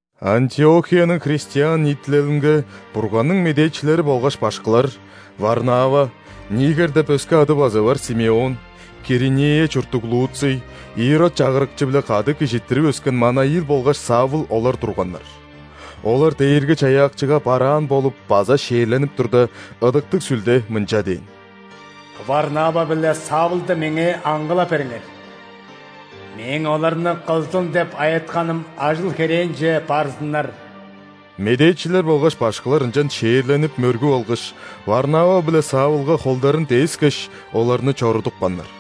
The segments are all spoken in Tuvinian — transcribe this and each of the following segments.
Антиохияның христиан ниитилелинге Бурганның медээчилери болгаш башкылар: Варнава, Нигер деп өске ады база бар Симеон, Киринея чурттуг Луций, Ирод чагырыкчы-биле кады кижизиттирип өскен Манаил болгаш Савл олар турганнар. Олар Дээрги-Чаяакчыга бараан болуп база ·шээрленип турда, Ыдыктыг Сүлде мынча дээн: «Варнава биле Савлды меңээ аңгылап бериңер, Мээң оларны кылзын деп айытканым ажыл-херээнче барзыннар». Медээчилер болгаш башкылар ынчан шээрленип, мөргүп алгаш, Варнава биле Савлга холдарын дээскеш, оларны чорудупканнар.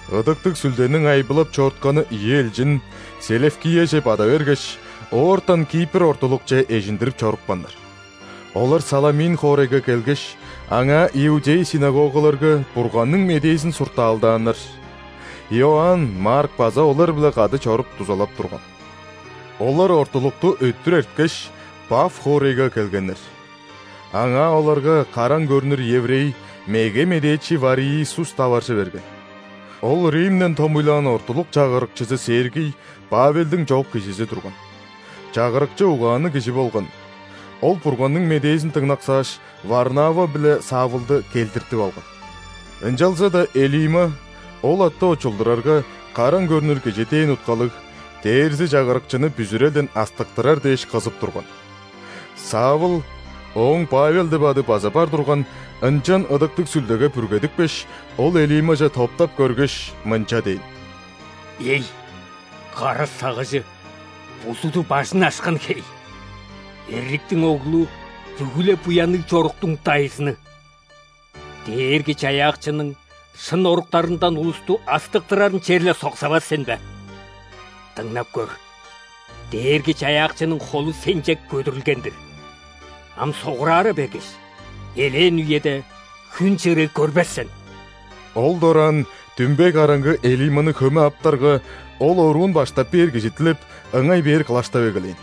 Ыдыктыг Сүлдениң айбылап чорутканы ийи элчин Селевкияже бада бергеш, оортан Кипр ортулукче эжиндирип чорупканнар. Олар Саламин хоорайга келгеш, аңаа иудей ·синагогаларга Бурганның медээзин суртаалдааннар. Иоанн Марк база олар-биле кады чоруп, дузалап турган. Олар ортулукту өттүр эрткеш, Паф хоорайга келгеннер. Аңаа оларга караң көрнүр еврей, меге медээчи Вариисус таваржы берген. Ол Римден томуйлаан ортулук чагырыкчызы Сергий Павелдиң чоок кижизи турган. Чагырыкчы угаанныг кижи болган. Ол Бурганның медээзин дыңнаксааш, Варнава биле Савлды келдиртип алган. Ынчалза-даа Элима (ол атты очулдурарга, «Караң көрнүр кижи» дээн уткалыг) дээрзи чагырыкчыны бүзүрелден астыктырар дээш кызып турган. Савл (ооң Павел деп ады база бар турган) ынчан Ыдыктыг Сүлдеге бүргедипкеш, ол Элимаже топтап көргеш, мынча дээн: «Эй, кара сагыжы, бузуду бажын ашкан хей, эрликтиң оглу, бүгү-ле буянныг чоруктуң дайзыны! Дээрги-Чаяакчының шын оруктарындан улусту астыктырарын черле соксавас сен бе? Дыңнап көр, Дээрги-Чаяакчының холу сенче көдүрүлген-дир, ам согурара бергеш, элээн үеде хүн чырыы көрбес сен». Ол дораан дүмбей караңгы Элиманы хөме аптарга, ол оруун баштап бээр кижи дилеп, ыңай-бээр кылаштап эгелээн.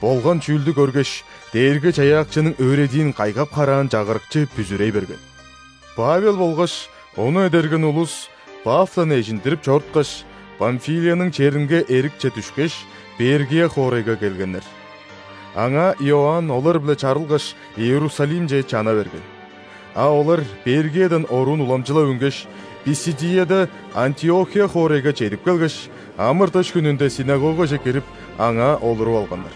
Болган чүүлдү көргеш, Дээрги-Чаяакчының өөредиин кайгап-хараан чагырыкчы бүзүрей берген. Павел болгаш ону эдерген улус Пафтан эжиндирип чоруткаш, Памфилияның черинге эрикче дүшкеш, Пергия хоорайга келгеннер. Аңаа Иоанн олар-биле чарылгаш, Иерусалимче чана берген. А олар Пергиядан оруун уламчылап үнгеш, Писидияда Антиохия хоорайга чедип келгеш, ·амыр-дыш хүнүнде ·синагогаже кирип, аңаа олуруп алганнар.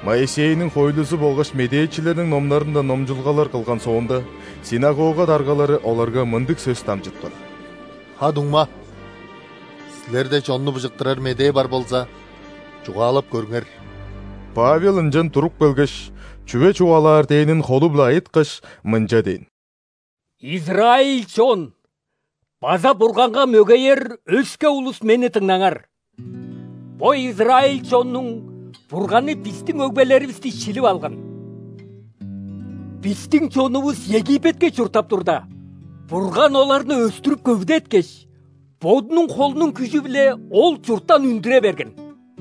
Моисейниң хоойлузу болгаш медээчилерниң номнарындан номчулгалар кылган соонда, синагога даргалары оларга мындыг сөс дамчыткан: «Ха-дуңма, силерде чонну быжыктырар медээ бар болза, чугаалап көрүңер». Павел ынчан туруп келгеш, чүве чугаалаар дээнин холу-биле айыткаш, мынча дээн: «Израиль чон база Бурганга мөгеер өске улус, мени дыңнаңар! Бо израиль чоннуң Бурганы бистиң өгбелеривисти шилип алган. Бистиң чонувус Египетке чурттап турда, Бурган оларны өстүрүп-көвүдеткеш, Бодунуң холунуң күжү-биле ол чурттан үндүре берген.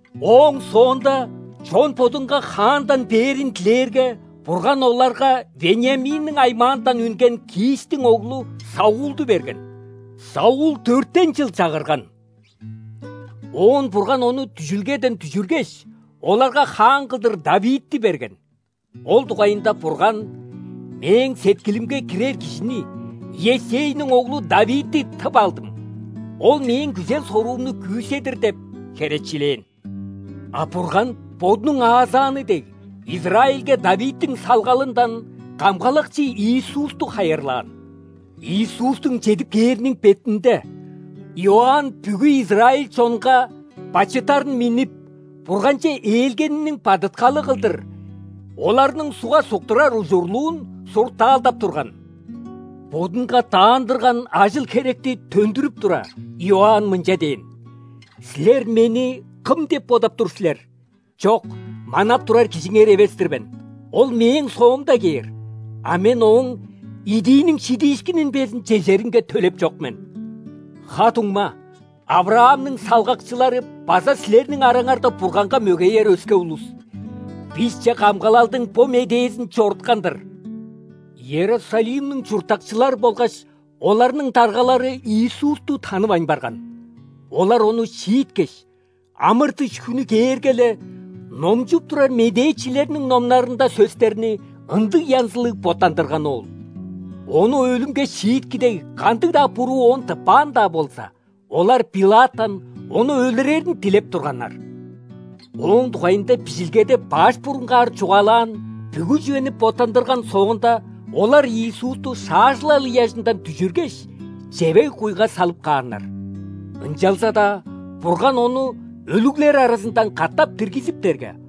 Ооң соонда чон бодунга хаандан бээрин дилээрге, Бурган оларга Вениаминниң аймаандан үнген Кистиң оглу Саулду берген. Саул дөртен чыл чагырган. Оон Бурган ону дүжүлгеден дүжүргеш, оларга хаан кылдыр ·Давидти берген. Ол дугайында Бурган: „Мээң сеткилимге кирер кижини – Иессейниң оглу Давидти тып алдым. Ол Мээң күзел-соруумну күүседир“ – деп херечилээн. А Бурган, Бодунуң аазааны дег, Израильге Давидтиң салгалындан Камгалакчы Иисусту хайырлаан. Иисустуң чедип кээриниң бетинде, Иоанн бүгү израиль чонга бачыттарын миннип, Бурганче ээлгениниң бадыткалы кылдыр оларның ·сугга суктурар ужурлуун суртаалдап турган. Бодунга даандырган ажыл-херекти төндүрүп тура, Иоанн мынча дээн: „Силер мени кым деп бодап тур силер? Чок, манап турар Кижиңер эвес-тир мен. Ол мээң соомда кээр, а мен Ооң идииниң шидиишкинин безин чежеринге төлеп чок мен“. Ха-дуңма, ·Авраамның салгакчылары база силерниң араңарда Бурганга мөгеер өске улус! Бисче камгалалдың бо медээзин чоруткан-дыр! Иерусалимниң чурттакчылары болгаш оларның даргалары Иисусту танывайн барган. Олар Ону шииткеш, ·амыр-дыш хүнү кээрге-ле, номчуп турар медээчилерниң номнарында сөстерни ындыг янзылыг боттандырганы ол. Ону өлүмге шиитки дег, кандыг-даа буруу Оон тыппаан-даа болза, олар Пилаттан Ону өлүрерин дилеп турганнар. Ооң дугайында Бижилгеде баш бурунгаар чугаалаан бүгү чүвени боттандырган соонда, олар Иисусту шаажылал ыяжындан дүжүргеш, чевег-куйга салып кааннар. Ынчалза-даа Бурган Ону өлүглер аразындан катап диргизиптерге,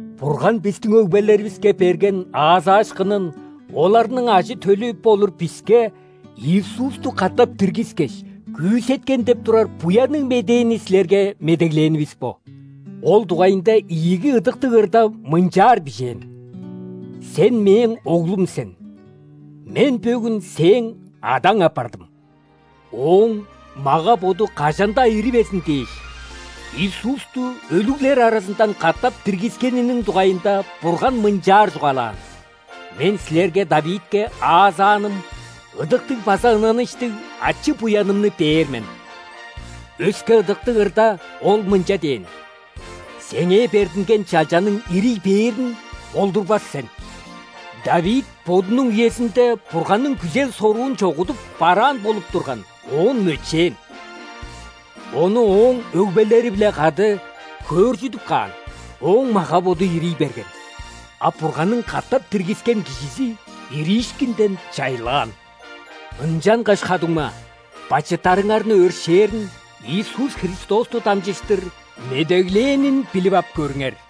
Бурган бистиң өгбелеривиске берген аазаашкынын оларның ажы-төлү болур биске, Иисусту катап диргискеш, күүсеткен деп турар Буянныг Медээни силерге медеглээнивис бо. Ол дугайында ийиги Ыдыктыг ырда мынчаар бижээн: „Сен – Мээң Оглум сен, Мен бөгүн Сээң Адаң апардым!“ Ооң мага-боду кажан-даа иривезин дээш, Иисусту өлүглер аразындан катап диргискениниң дугайында Бурган мынчаар чугаалаан: „Мен силерге Давидке аазааным ыдыктыг база ынаныштыг ачы-буянымны бээр мен“. Өске Ыдыктыг ырда Ол мынча дээн: „Сеңээ бердинген Чалчаңның ирий бээрин болдурбас сен“. Давид бодунуң үезинде Бурганның күзел-соруун чогудуп, бараан болуп турган, оон мөчээн. Ону ооң өгбелери-биле кады хөөржүдүп каан, ооң мага-боду ирий берген. А Бурганның катап диргискен Кижизи ириишкинден чайлаан! Ынчангаш, ха-дуңма, бачыттарыңарны өршээрин Иисус Христосту дамчыштыр медеглээнин билип ап көрүңер.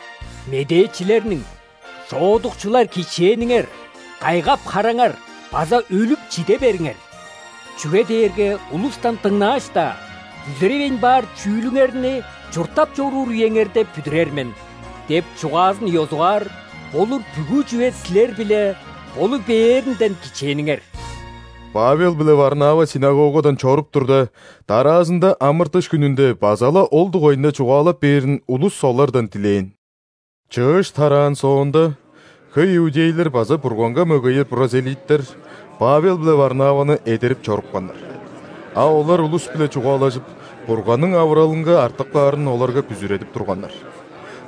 Медээчилерниң:„Шоодукчулар, кичээниңер! Кайгап-хараңар база өлүп чиде бериңер.Чүге дээрге улустан дыңнааш-даа, бүзүревейн баар чүүлүңерни чурттап чоруур үеңерде бүдүрер мен“– деп чугаазын ёзугаар болур бүгү чүве силер-биле болу бээринден кичээниңер!» Павел биле Варнава ·синагогадан чоруп турда, дараазында ·амыр-дыш хүнүнде база-ла ол дугайында чугаалап бээрин улус олардан дилээн. Чыыш тараан соонда, хөй иудейлер база Бурганга мөгеер ·прозелиттер Павел биле Варнаваны эдерип чорупканнар. А олар улус-биле чугаалажып, Бурганның авыралынга артып каарын оларга бүзүредип турганнар.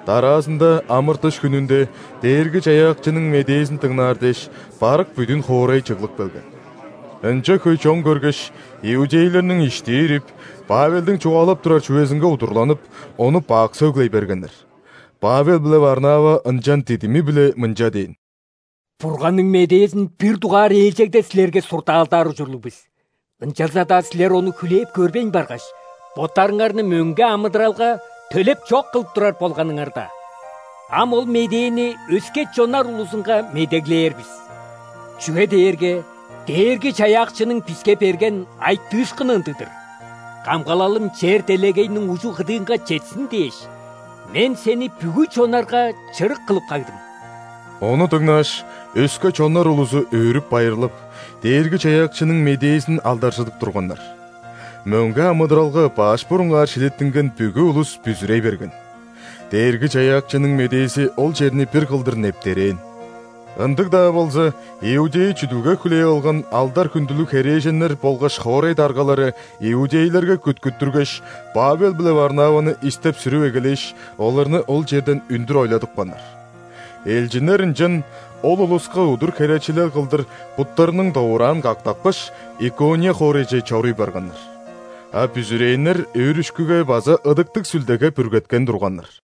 Дараазында амыр-дыш хүнүнде Дээрги-Чаяакчының медээзин дыңнаар дээш, барык бүдүн хоорай чыглып келген. Ынча хөй чон көргеш, иудейлерниң ишти ирип, Павелдиң чугаалап турар чүвезинге удурланып, ону бак сөглей бергеннер. Павел биле Варнава ынчан дидими-биле мынча дээн: «Бурганның медээзин бир дугаар ээлчегде силерге суртаалдаар ужурлуг бис. Ынчалза-даа силер ону хүлээп көрбейн баргаш, боттарыңарны мөңге амыдыралга төлеп чок кылып турар болганыңарда, ам ол медээни өске чоннар улузунга медеглээр бис. Чүге дээрге Дээрги-Чаяакчының биске берген айтыышкыны ындыг-дыр:„Камгалалым чер-делегейниң ужу-кыдыынга четсин дээш,Мен Сени бүгү чоннарга чырык кылып кагдым“». Ону дыңнааш, өске чоннар улузу өөрүп-байырлап, Дээрги-Чаяакчының медээзин алдаржыдып турганнар. Мөңге амыдыралга баш бурунгаар шилиттинген бүгү улус бүзүрей берген. Дээрги-Чаяакчының медээзи ол черни бир кылдыр нептерээн. Ындыг-даа болза, иудей чүдүлге хүлээп алган алдар-хүндүлүг херээженнер болгаш хоорай даргалары иудейлерге күткүттүргеш, Павел биле Варнаваны истеп-сүрүп эгелээш, оларны ол черден үндүр ойладыпканнар. Элчиннер ынчан ол улуска удур херечилел кылдыр буттарының довураан кактапкаш, Икония хоорайже чоруй барганнар. А бүзүрээннер өөрүшкүге база Ыдыктыг Сүлдеге бүргеткен турганнар.